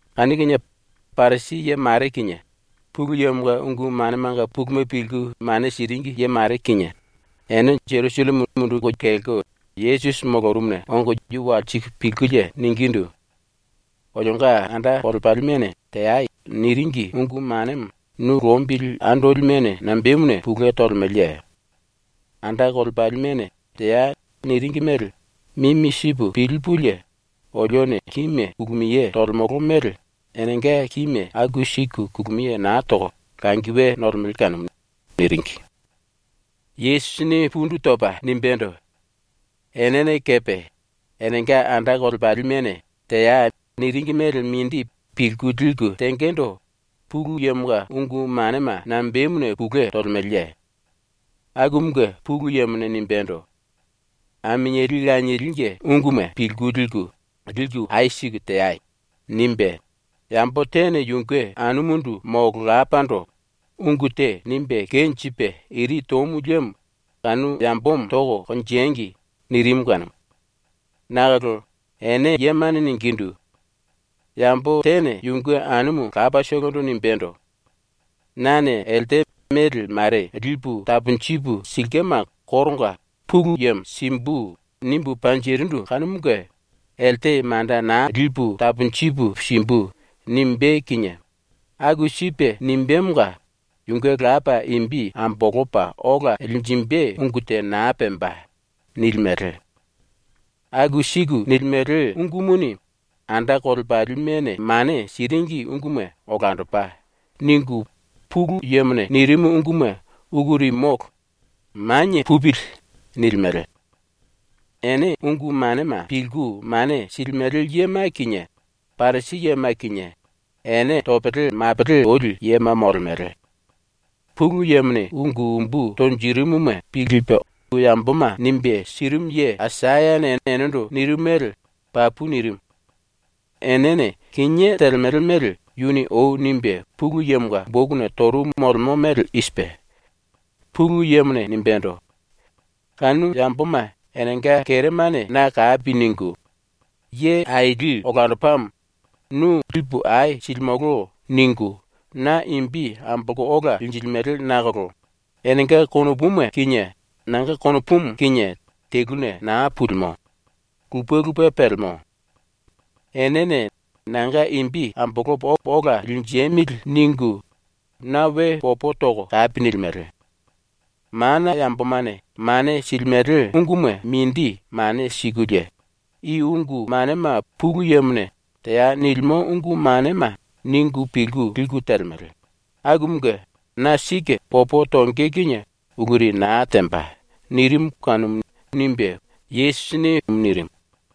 Kanu kinie Parisi ye mare kinie, Pulu Yemonga ungu manemanga puluma pilku mane siringi ye mare kinie ene Jerusalleme munduku kelko Yesusi molorumuna ongo yu walsiku pilkulie ningindu: “Olionga anda kolepalimene “Teai.” niringi ungu manemo nu lombili andolimene nambemuna pulue tolemeleye? ⸤Anda kolepalimene “Teai.” niringi mele mimi sipu pilipulie olione kíme kulumiye tolemolo mele⸥ enenga kíme aku siku kulumiye na toko langi we nolemele kanumu.” niringi. Yesusini pundu topa nimbendo: “Enene kepe enenga anda kolepalimene “Teai.” niringi mele mindi pilku liku tengendo Pulu Yemonga ungu manema nambemuna pulue tolemeleye? Akumunge Pulu Yemone nimbendo: “Aminieli lanielinge unguma pilku liku, liku ai siku teai.” nimbe “Yambo tene yunge anumundu molo lapando ungu te nimbe kenjipe iri tomu liemo kanu yambomo toko konjengi.” nirimu kanumu. Nakolo ene yemane ningindu: “Yambo tene yunge anumu lapatolondo nimbendo: “Nane elte mele mare lipu taponjipu silkema koronga ‘Pulu Yemo simbu.’ nimbu panjirindu kanumunge elte manda naa lipu taponjipu simbu.” nimbé kinie ⸤aku sipe nimbemonga⸥ yunge lapa imbi ambolopa ola linjimbe ungu te naa pemba.” nilimele. Aku siku nilimele ungumuni ‘Anda kolepalimene mane siringi unguma olandopa.’ ningu ‘Pulu Yemone nirimu ungumu uluri molo. Manie pupili.’ nilimele. “Ene ⸤ungu manema pilku mane silimele yema kinie Parisi yema kinie⸥ ene topele mapele toli yema molemele! Pulu Yemone ungu umbu tonjirimuma pilku yamboma nimbe sirimu ye Aisayane enendo nirimu mele papu nirimu. ⸤Enene kinié telemele mele yuni ou nimbe Pulu Yemonga bokuna torumu molemo mele i sipe:⸥ ⸤Pulu Yemone nimbendo:⸥ “Kanu yamboma enenga keremane na kapi ningu ‘Ye aili olandopamo. Nu lipu ai silimolo.’ ningu na imbi ambolko ola linjilimele nakolo enenga konopuma kinie nanga konopumu kinie teluna naa pulimo. Lupe lupe pelemo. Enene ‘Nanga imbi ambolopo ola linjemili.’ ningu na we popo toko kapi nilimele. Mana yambomane mane silimele unguma mindi mane sikulie ‘I ungu manema Pulu Yemone “Teai.” nilimo ungu manema.’ ningu pilku liku telemele, akumunge na sike popo tonge kinie uluri naa temba.” nirimu kanumu.” nirimu.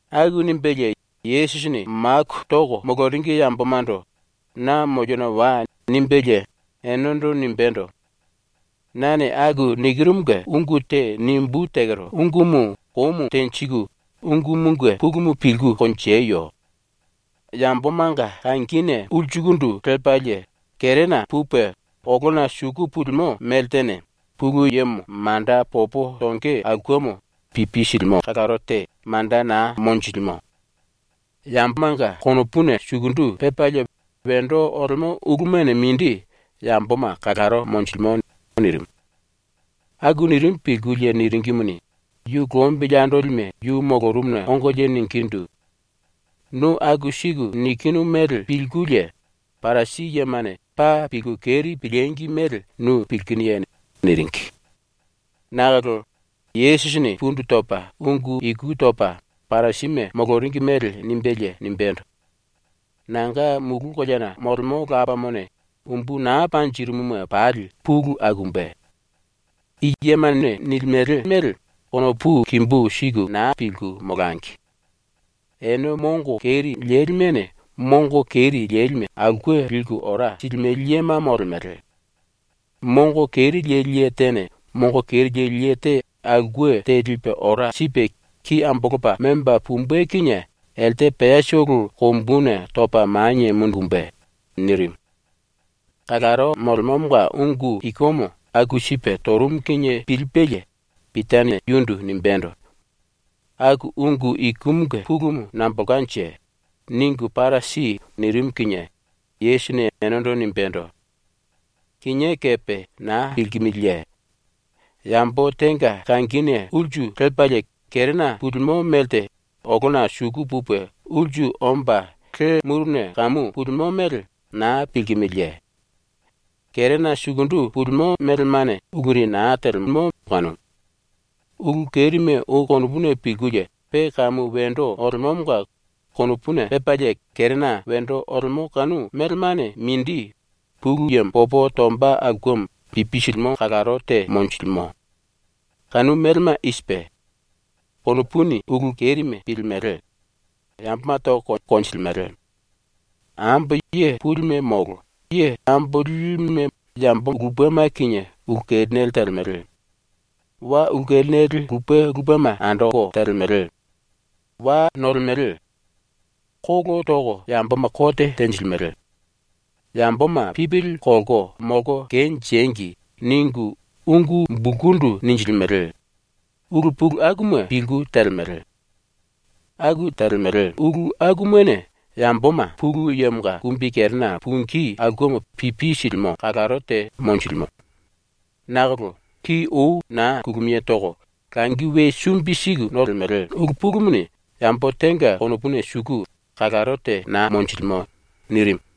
Aku nimbelie Yesusini maku toko moloringi yambomando “Na moliona wai.” nimbelie enendo nimbendo: “Nane ⸤aku nikirumunge ungu te⸥ nimbú tekero ungumu komu tenjiku ungumunge pulumu pilku konjeyo. Yambomanga kangine ulsukundu lepalie kerena pupe olona suku pulimo meltene ⸤Pulu Yemo manda popo tonge aulkemo pipi silimo⸥ kalaro te manda naa monjilimo. Yambomanga konopuna sukundu pepalie wendo olemo ulumane mindi yamboma kalaro monjilimo.” nirimu. Aku nirimu pilkulie niringimuni, yu lombili andolime yu molorumuna ongolie ningindu: “Nu aku siku nikinu mele pilkulie Parisi yemane paa pilku keri pilíngi mele nu pilkinuye?” niringi. Nakolo Yesusini pundu topa ⸤ungu iku topa Parisime moloringi mele nimbelie⸥ nimbendo: “Nanga mulu koleana molemo Lapamone umbu naa panjirimuma pali pulu akumbe. I yemane nilimele mele konopu kimbu siku naa pilku molangi. Ene mongo keri lelimene ⸤mongo keri lelime⸥ aulke liku ora silimele yema molemele. Mongo keri leli ye tene mongo keri leli ye te aulke te lipe ora sipe ki ambolopa memba pumbe kinie elte peatolo kombuna topa manie mundumbe.” nirimu. ⸤Kalaro molemomonga ungu ikumu aku sipe torumu kinie pilipelie⸥ Pitane yundu nimbendo: “Aku ungu ikumunge pulumu nambolkanje? Ningu para si.” nirimu kinie Yesusini enendo nimbendo: “Kinié kepe naa pilkimiliye? Yambo tenga kangine ulsu lepalie kerena pulimo melte olona suku pupe ulsu omba le muruna kamu pulimo mele naa pilkimiliye? Kerena sukundu pulimo melemane uluri na telemo kanumu. Ulu kerime ou konopuni pilkulie pe kamu wendo olemomonga konopuna pepalie kerena wendo olemo kanu melemane mindi ⸤Pulu Yemo popo tomba aulkemo pipi silimo⸥ kalaro te monjilimo. Kanu melema i sipe: Konopuni ulu kerime pilimele, yamboma toko konjilimele, ambo ye pulime molo ye ambo lilime yambo lupema kinie ulu kerinele telemele, wa ulu kerinele lupe lupema andoko telemele, wa nolemele, kolo toko yamboma kote tenjilimele, ‘Yamboma pipili kolko molko kenjengi!’ ningu ungu bulkundu ninjilimele, ulu pulu akuma pilku telemele. Aku telemele ulu akumane yamboma ⸤Pulu Yemonga kumbikerena pungí aulkemo pipi silimo⸥ kalaro te monjilimo. Nakolo ki ou naa kulumiye toko langi we sumbi siku nolemele ulu pulumuni ⸤yambo tenga konopuna suku⸥ kalaro te naa monjilimo.” nirimu.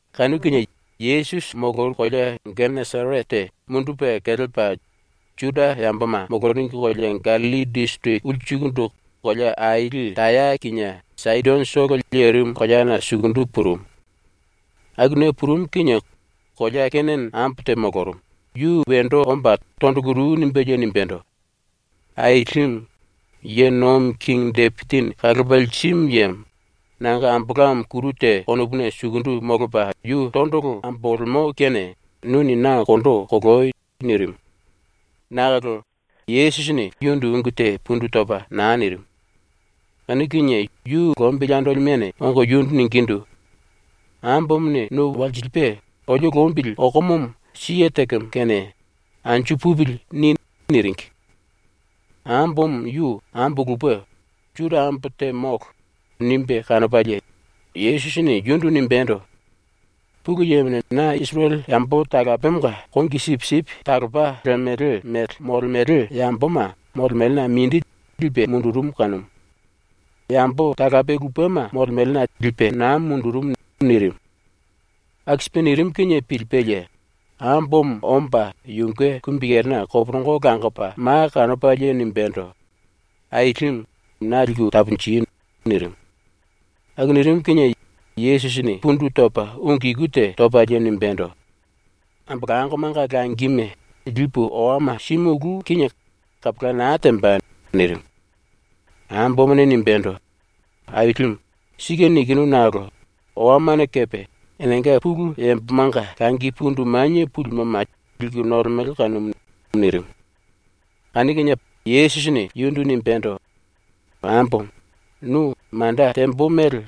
Kanu kinie Yesusi molorumu kolea ⸤Geneserete⸥ mundupe kelepa ⸤Juda yamboma moloringi kolea Gallilli disiriki ulsukundu⸥ kolea aili Taya kinie Saidonotolo lerimu koleana sukundu purumu. Akuna purumu kinie kolea Kenane ambo te molorumu, yu wendo omba tondolo ru nimbelie nimbendo: “Ailimu, Ye Nomi Kingi Depisini Kalopa Lirimu Yemo, nanga ambolamo kuru te konopuna sukundu molopa yu tondolo ambolemo kene nuni na kondo koloi!” nirimu. Nakolo Yesusini yundu ungu te pundu topa na nirimu. Kanu kinie yu lombili andolimene ongo yundu ningindu: “Ambomone nu walsilipe olio lombili okomomo ⸤siye tekemo⸥ kene ‘Anju pupili.’ ni.” niringi. ⸤Ambomo yu ambo lupe, Juda ambo te molo, nimbe kanopalie⸥ Yesusini ⸤yundu⸥ nimbendo: “Pulu Yemone na Isirele yambo talapemonga kongi sipisipi talopa lemele mele molemele yamboma molemelena mindi lipe mundurumu kanumu. Yambo talape lupema molemelena lipe naa mundurumu.” nirimu. Aku sipe nirimu kinie pilipelie ambomo omba yunge kumbikerena koporongo langopa ma kanopalie nimbendo: “Ailimu, na liku taponji.” nirimu. Aku nirimu kinie Yesusini pundu topa ⸤ungu iku te topalie⸥ nimbendo: “Ambolangomanga langime lipu owama simulú kinie kapola naa temba.” nirimu. Ambomone nimbendo: “Ailimu, sike nikinu nakolo owamane kepe enenga pulu yambomanga langi pundu manie pulimoma liku nolemele kanumu.” nirimu. Kanu kinie Yesusini yundu nimbendo: “Ambomo, nu manda tembo mele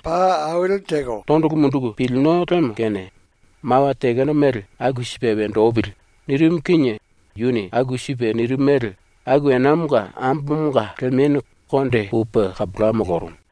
tondolo munduku pilino lemo kene mawa tekeno mele aku sipe wendo opili.” nirimu kinie yuni aku sipe nirimu mele aku enamonga ambomonga lemenu konde pupe kapola molorumu.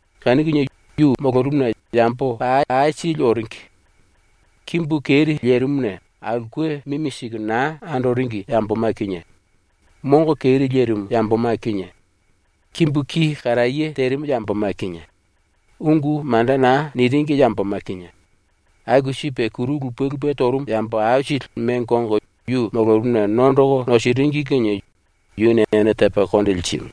Kanu kinie yu molorumuna yambo paa aisili oringi. Kimbu keri lerimuna aulke mimi siku na andoringi yamboma kinie, mongo keri lerimu yamboma kinie, kimbu ki karaye terimu yamboma kinie, ungu manda naa niringi yamboma kinie, aku sipe kuru lupe lupe torumu yambo aisili mengo ongo yu molorumuna nondoko nosiringi kinie yuni ene tepa konde lirimu.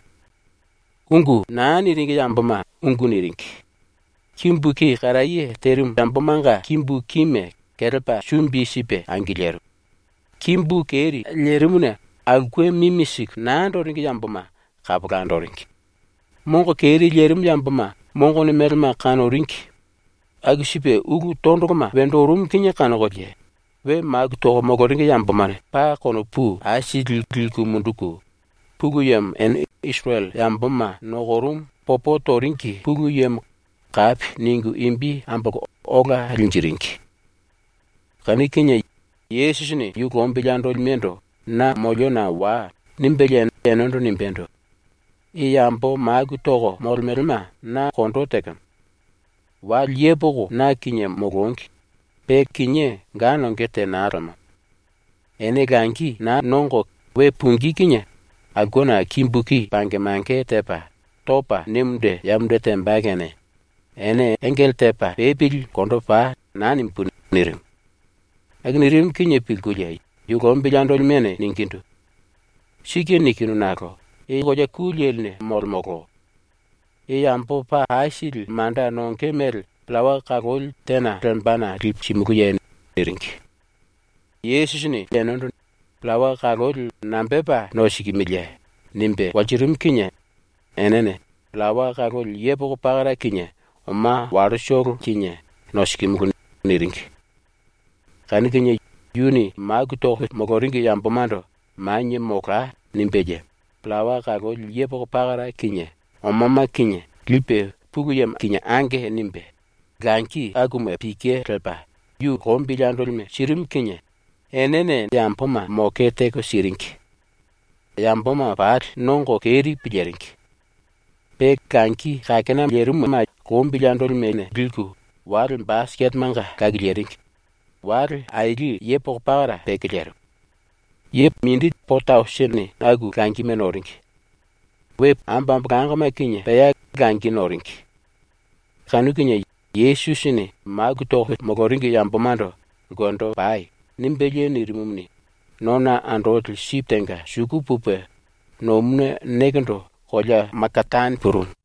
Ungu naa niringi yamboma ungu niringi; kimbu ki karaye terimu yambomanga kimbu kime kelepa sumbi sipe angilirimu; kimbu keri lerimuna aulke mimi siku naa andoringi yamboma kapola andoringi; mongo keri lerimu yamboma mongone melema kanoringi; aku sipe ulu tondoloma wendo orumu kinie kanokolie we maku toko moloringi yambomane paa konopu aisili liku munduku, Pulu Yemo ene Isirele yamboma nokorumu popo toringi Pulu Yemo kapi ningu imbi ambolko ola linjiringi. Kanu kinie Yesusini yu lombili andolimendo “Na moliona wai.” nimbelie enendo nimbendo: “I yambo maku toko molemelema na kondo tekemo. Wale yepoko na kinie molongi, pe kinié ga nonge te naa lemo. Ene langi naa nongo we pungí kinie aulkena kimbu ki pange mange tepa, topa ne munde ya munde temba kene ‘ene engele tepa pepili ulkendo pai.’ naa nimbú.” nirimu. Aku nirimu kinie pilkulie yu lombili andolimene ningindu: “⸤Sike nikinu nakolo⸥ i kolea ku leline molemolo. I yambo paa aisili manda nonge mele pillawa kaloli tena lembana lipu simulúye?” niringi. Yesusini enendo “Pillawa kaloli nambepa nosikimiliye?” nimbe walsirimu kinie enene “Pillawa kaloli yepoko pakara kinie oma wallotolo kinie nosikimulu.” niringi. Kanu kinie yuni maku toko moloringi yambomando “Manie molai.” nimbelie, pillawa kaloli yepoko pakara kinie omama kinie lipe Pulu Yemo kinie “Ange.” nimbe, langi akuma pike lepa yu lombili andolime sirimu kinie enene yamboma moke teko siringi. Yamboma pali nongo keri piliringi. Pe langi kakena lerimuma lombili andolimene liku wale basiketemanga lakiliringi, wale aili yepoko pakara peke lerimu. Ye po tausinini aku langime noringi. Ambo ambolangoma kinie pea langi noringi. Kanu kinie Yesusini maku toko moloringi yambomando “Ulkendo pai.” nimbelie nirimumuni, nona andoli sipi tenga suku pupe, ⸤nomuna nekendo⸥ kolea Makatane purumu.